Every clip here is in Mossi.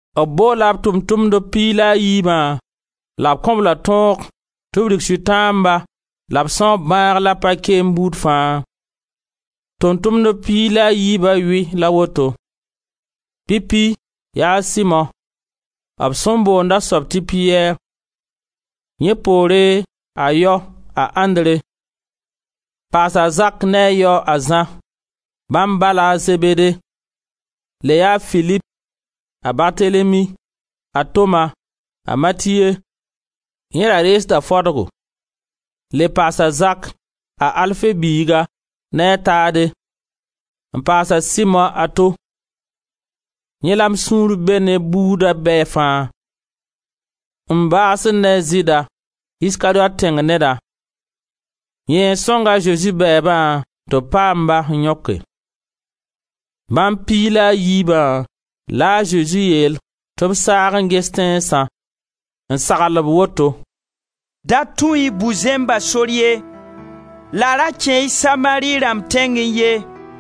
B boola b Tʋʋm-tʋmdb piig la a yiibã la b kõ-b-la tõog tɩ b rig Sʋtãamba la b sãoog bãag la pa-keem buud fãa. Tʋʋm-tʋmdb piig la a yiibã yʋy la woto: pipi yaa a Simo, b sẽn boond a soab tɩ Piyɛr; yẽ poore, a yao, a Andre, n paas a Zak ne a yao, a Zã, bãmb ba la a Zebede; le yaa a Filip, a Bartelemi, a Toma, a Matiye, yẽ da reegda fadgo; le paasa a Zak, a Alfe biiga ne a Taade, n paas a Simo a to: yẽ la m sũur bee ne buuda bɛ fãa; n baasd ne a Zɩɩda, Iskariyot tẽng neda; yẽ n sõng a Zezi bɛɛba tɩ b paam-ba n yõke. Bãmb piig la a yiibã la a Zezi yeel tɩ b saag n ges tẽnsã, n sagl-b woto: «Da tũ-y bu-zẽmba sor ye, la ra kẽ-y Samari rãmb tẽngẽ ye.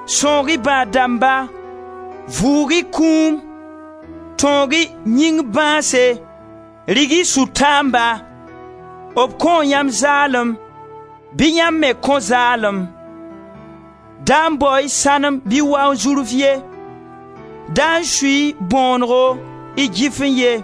Sãoog-y bãad dãmba, vʋʋg-y kũum, tõog-y yĩng bãase, dig-y Sʋtãamba. B kõo yãmb zaalem, bɩ yãmb me kõ zaalem. Da bao-y sãnem bɩ wanzurf ye, da sui-y bõonego y gɩfẽ ye.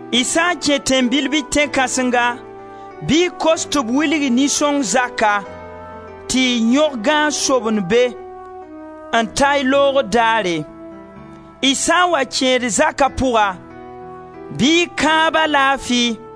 Y sã n kẽ tẽn-bil bɩ tẽn-kãsenga, bɩ y kos tɩ b wilg-y nin-sõng zaka tɩ y yõg gãag-sobend be, n ta y loogr daare. Y sã n wa kẽed zaka pʋga bɩ y kãab-a laafi,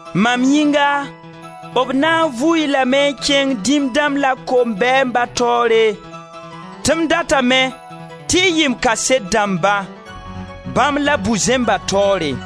Mam yĩnga, b na n vu-y lame n kẽng dĩm dãmb la kombɛɛmba taoore, tɩ m datame tɩ y yɩ m kaset dãmba, bãmb la bu-zẽmba taoore.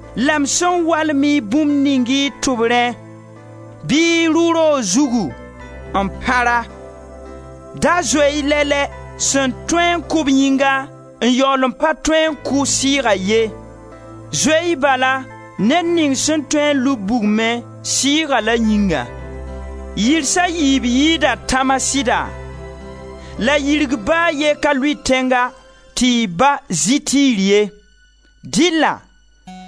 la m sẽn walem-y bũmb ning y tʋbrẽ bɩ y rʋ roog zugu n pãr-a. Da zoe-y lɛ-lɛ sẽn tõe n kʋ-b yĩngã n yaool n pa tõe n kʋ sɩɩga ye. Zoe-y bala, ned ning sẽn tõe n lub bugmẽ sɩɩga la yĩngã. Yirsa yiib yɩɩda tãma sɩda? La yirg ba a ye ka lʋɩt tẽnga tɩ y Ba zɩ tiir ye. Dɩlla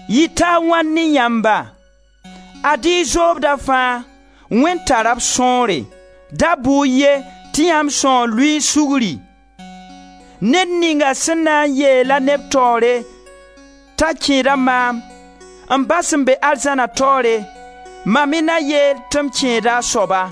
yɩta a wãn ne yãmba. Ad-y y zoobda fãa, Wẽnd tara b sõore! Da bʋ-y ye, tɩ yãmb sãoo luin-sugri. Ned ninga sẽn na n yeel-a neb taoore t'a kẽeda maam, m Ba sẽn be arzãna taoore, mam me na yeel tɩ m kẽeda a soaba.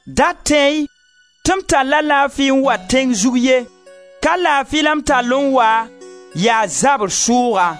Da tẽ-y tɩ m talla laafi n wa tẽng zug ye, ka laafi la m tall n wa, yaa zabr sʋʋga.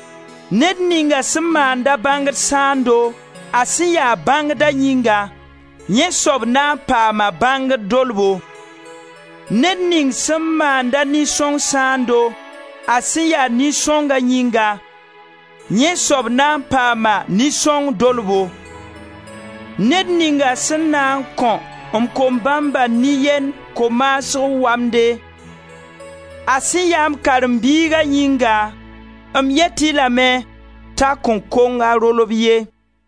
Ned ninga sẽn maand-a bãngd sãando a sẽn ya bãngda yĩnga, yẽ soab na n paama bãngd dolbo. Ned ning sẽn maand-a nin-sõng sãando a sẽn ya nin-sõnga yĩnga, yẽ soab na n paama nin-sõng dolbo. Ned ninga sẽn na n kõ m kom-bãmba nin-yend ko-maasg wamde, a sẽn ya m karen-biiga yĩnga, m yet-y lame t'a kõn kong a rolb ye.»